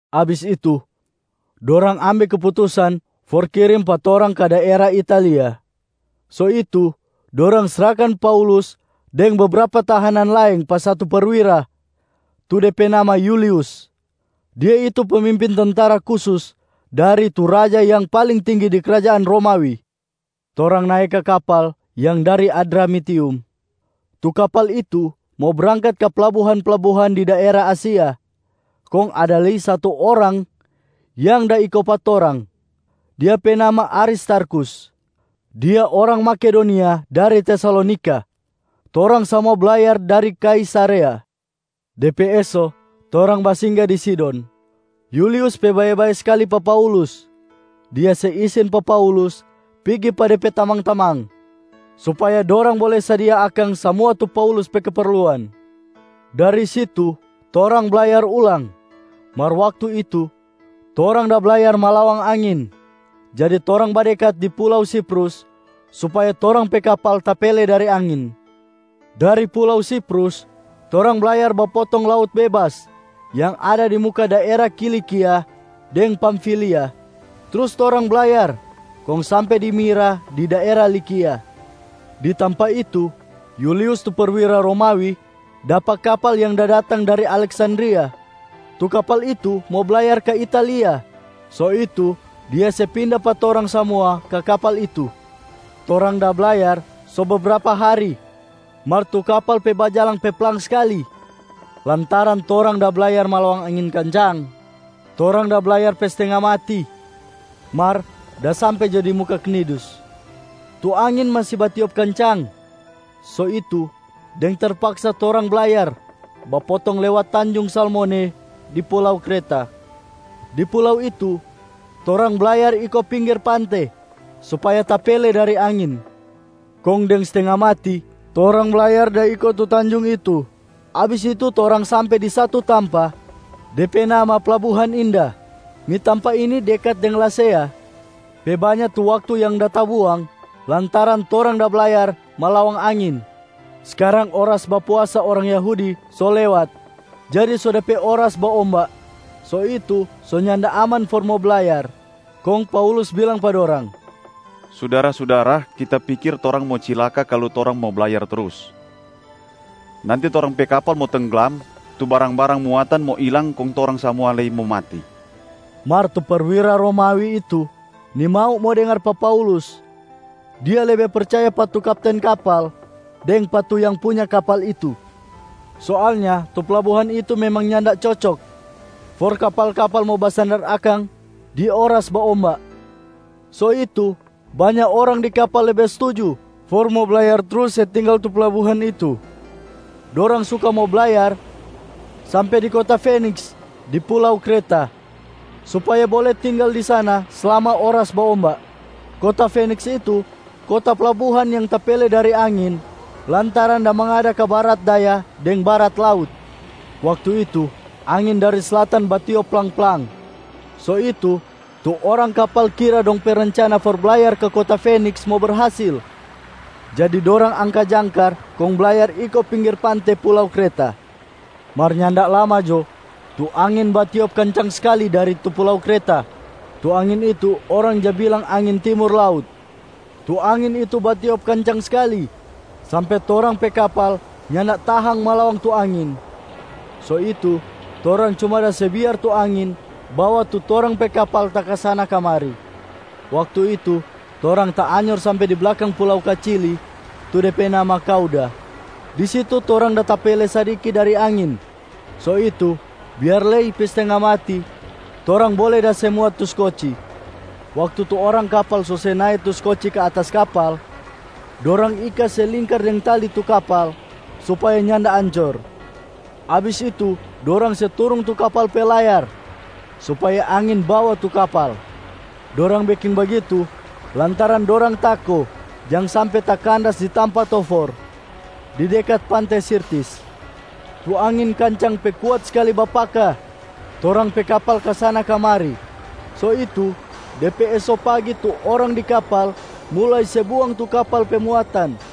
Abis itu, dorang ambe keputusan for kirim pa torang ka daera Italia. So itu, dorang srahkan Paulus deng bebrapa tahanan laeng pa satu perwira tu de pe nama Yulius. Dia itu pemimpin tentara kusus dari tu raja yang paling tinggi di krajaan Romawi. Torang nae ka kapal yang dari Adramitium. Tu kapal itu mo brangkat ka plabuhan-plabuhan di daera Asia. Kong ada lei satu orang yang da iko pa torang, dia pe nama Aristarkhus, dia orang Makedonia dari Tesalonika. Torang samua blayar dari Kaisarea. De pe eso, torang basingga di Sidon. Yulius pe bae-bae skali pa Paulus. Dia se isin pa Paulus pigi pa de pe tamang-tamang supaya dorang bole sadia akang samua tu Paulus pe keperluan. Dari situ torang blayar ulang. Mar waktu itu torang da blayar malawang angin, jadi torang badekat di pulau Siprus supaya torang pe kapal tapele dari angin. Dari pulau Siprus, torang blayar bapotong laut bebas yang ada di muka daera Kilikia deng Pamfilia, trus torang blayar kong sampe di Mira di daera Likia. Di tampa itu, Yulius tu perwira Romawi dapa kapal yang da datang dari Aleksandria, tu kapal itu mo blayar ka Italia. So itu dia se pinda pa torang samua ka kapal itu. Torang da blayar so bebrapa hari mar tu kapal pe bajalang pe plang skali, lantaran torang da blayar malawang angin kancang. Torang da blayar pe stenga mati, mar da sampe jo di muka Knidus. Tu angin masi batiop kancang, so itu deng terpaksa torang blayar bapotong lewat tanjung Salmone di pulau Kreta. Di pulau itu torang blayar iko pinggir pante supaya tapele dari angin. Kong deng stenga mati torang blayar da iko tu tanjung itu. Abis itu torang sampe di satu tampa, de pe nama Plabuhan Indah. Ni tampa ini dekat deng Lasea. Pe banya tu waktu yang da tabuang lantaran torang da blayar malawang angin. Skarang oras bapuasa orang Yahudi so lewat jadi so de pe oras baomba, so itu so nyanda aman for mo blayar. Kong Paulus bilang pa dorang, “Sudara-sudara, kita pikir torang mo cilaka kalu torang mo blayar trus. Nanti torang pe kapal mo tengglam, tu barang-barang muatan mo ilang kong torang samua lei mo mati.” Mar tu perwira Romawi itu nimau mo dengar pa Paulus, dia lebe percaya pa tu kapten kapal deng pa tu yang punya kapal itu. Soalnya tu plabuhan itu memang nyanda cocok for kapal-kapal mo basandar akang di oras baomba. So itu, banya orang di kapal lebe stuju for mo blayar trus se tinggal tu plabuhan itu. Dorang suka mo blayar sampe di kota Feniks di pulau Kreta supaya bole tinggal di sana slama oras baomba. Kota Feniks itu kota plabuhan yang tapele dari angin lantaran da mangada ka barat daya deng barat laut. Waktu itu, angin dari slatan batiop plang-plang. So itu, tu orang kapal kira dong pe rencana for blayar ka kota Feniks mo berhasil. Jadi dorang angka jangkar kong blayar iko pinggir pante pulau Kreta. Mar nyanda lama jo, tu angin batiop kancang skali dari tu pulau Kreta. Tu angin itu orang ja bilang angin ‘Timur Laut’. Tu angin itu batiop kancang skali sampe torang pe kapal nyanda tahang malawang tu angin, so itu torang cuma da se biar tu angin bawa tu torang pe kapal takasana-kamari. Waktu itu torang taanyor sampe di blakang pulau kacili tu de pe nama Kauda, di situ torang da tapele sadiki dari angin. So itu biar lei pe stenga mati, torang bole da se muat tu skoci. Waktu tu orang kapal so se nae tu skoci ka atas kapal, dorang ika se lingkar deng tali tu kapal supaya nyanda ancor. Abis itu, dorang se turung tu kapal pe layar supaya angin bawa tu kapal. Dorang beking bagitu lantaran dorang tako jang sampe takandas di tampa tofor di dekat pante Sirtis. Tu angin kancang pe kuat skali bapaka torang pe kapal kasana-kamari, so itu de pe eso pagi tu orang di kapal mulai se buang tu kapal pe muatan.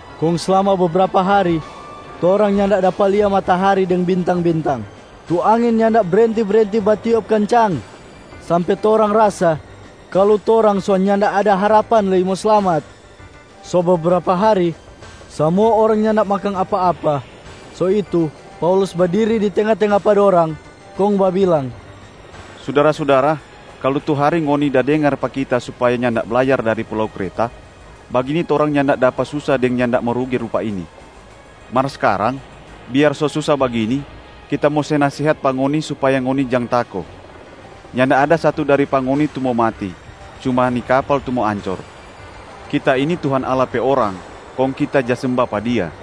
Kong slama bebrapa hari torang nyanda dapa lia matahari deng bintang-bintang. Tu angin nyanda brenti-brenti batiop kancang, sampe torang rasa kalu torang so nyanda ada harapan lei mo slamat. So bebrapa hari samua orang nyanda makang apa-apa. So itu Paulus badiri di tenga-tenga pa dorang kong babilang, “Sudara-sudara, kalu tu hari ngoni da dengar pa kita supaya nyanda blayar dari pulau Kreta, bagini torang nyanda dapa susa deng nyanda mo rugi rupa ini. Mar skarang, biar so susa bagini, kita mo se nasehat pa ngoni supaya ngoni jang tako. Nyanda ada satu dari pa ngoni tu mo mati, cuma ni kapal tu mo ancor. Kita ini Tuhan Allah pe orang, kong kita ja semba pa Dia.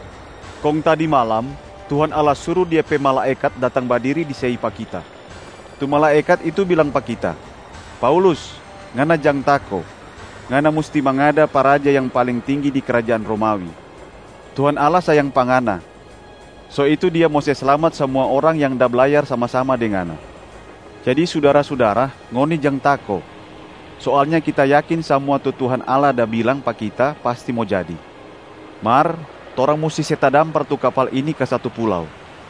Kong tadi malam, Tuhan Allah suru Dia pe malaekat datang badiri di sei pa kita. Tu malaekat itu bilang pa kita, ‘Paulus, ngana jang tako! Ngana musti mangada pa raja yang paling tinggi di krajaan Romawi. Tuhan Allah sayang pa ngana, so itu Dia mo se slamat samua orang yang da blayar sama-sama deng ngana.’ Jadi sudara-sudara, ngoni jang tako! Soalnya kita yakin samua tu Tuhan Allah da bilang pa kita pasti mo jadi. Mar torang musti se tadampar tu kapal ini ka satu pulau.”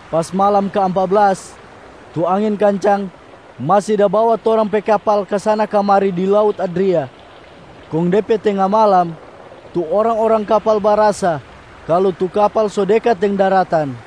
Pas malam kaampa blas, tu angin kancang masi da bawa torang pe kapal kasana-kamari di laut Adria. Kong de pe tenga malam, tu orang-orang kapal barasa kalu tu kapal so dekat deng daratan.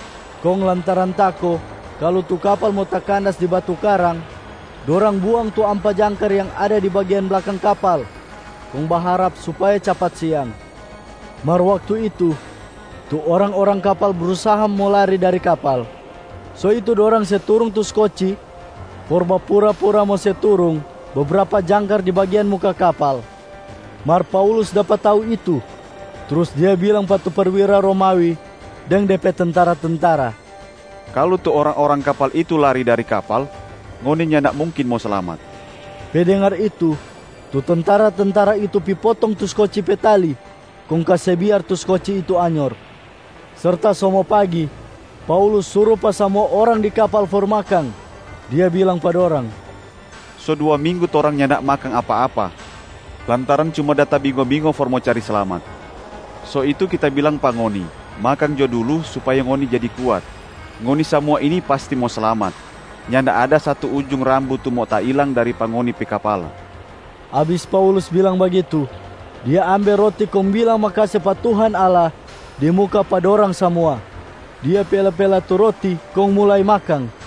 Kong lantaran tako kalu tu kapal mo takandas di batu karang, dorang buang tu ampa jangkar yang ada di bagian blakang kapal kong baharap supaya capat siang. Mar waktu itu, tu orang-orang kapal brusaha mo lari dari kapal. So itu dorang se turung tu skoci for bapura-pura mo se turung bebrapa jangkar di bagian muka kapal. Mar Paulus dapa tau itu, trus dia bilang pa tu perwira Romawi deng de pe tentara-tentara, “Kalu tu orang-orang kapal itu lari dari kapal, ngoni nyanda mungkin mo slamat.” Pe dengar itu, tu tentara-tentara itu pi potong tu skoci pe tali kong kase biar tu skoci itu anyor. Serta so mo pagi, Paulus suru pa samua orang di kapal for makang. Dia bilang pa dorang, “So dua minggu torang nyanda makang apa-apa lantaran cuma da tabingo-bingo for mo cari slamat. So itu kita bilang pa ngoni makang jo dulu supaya ngoni jadi kuat. Ngoni samua ini pasti mo slamat, nyanda ada satu ujung rambu tu mo tailang dari pa ngoni pe kapala.” Abis Paulus bilang bagitu, dia ambe roti kong bilang makase pa Tuhan Allah di muka pa dorang samua, dia pela-pela tu roti kong mulai makang.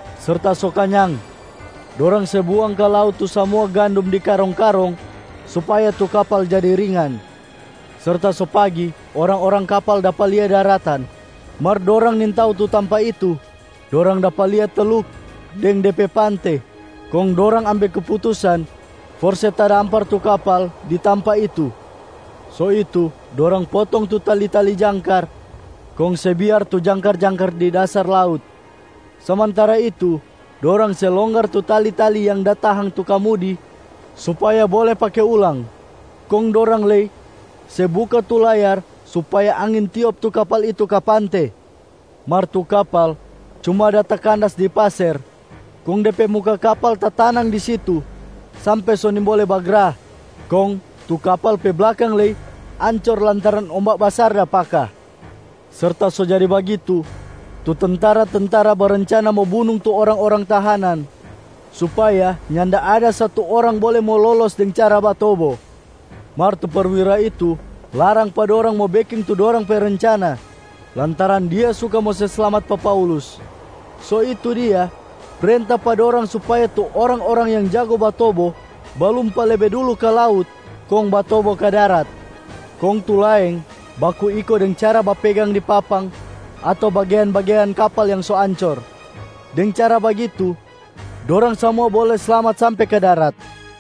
Serta so kanyang, dorang se buang ka laut tu samua gandum di karong-karong supaya tu kapal jadi ringan. Serta so pagi, orang-orang kapal dapa lia daratan, mar dorang nintau tu tampa itu. Dorang dapa lia teluk deng de pe pante. Kong dorang ambe keputusan for se tadampar tu kapal di tampa itu. So itu dorang potong tu tali-tali jangkar kong se biar tu jangkar-jangkar di dasar laut. Samantara itu dorang se longgar tu tali-tali yang da tahang tu kamudi supaya bole pake ulang. Kong dorang lei se buka tu layar supaya angin tiop tu kapal itu ka pante. Mar tu kapal cuma da takandas di paser, kong de pe muka kapal tatanang di situ sampe so nimbole bagra. Kong tu kapal pe blakang lei ancor lantaran omba basar da paka. Serta so jadi bagitu, tu tentara-tentara barencana mo bunung tu orang-orang tahanan supaya nyanda ada satu orang bole mo lolos deng cara batobo. Mar tu perwira itu larang pa dorang mo beking tu dorang pe rencana, lantaran dia suka mo se slamat pa Paulus. So itu dia prenta pa dorang supaya tu orang-orang yang jago batobo, balumpa lebe dulu ka laut kong batobo ka darat. Kong tu laeng baku iko deng cara bapegang di papang ato bagean-bagean kapal yang so ancor. Deng cara bagitu, dorang samua bole slamat sampe ka darat.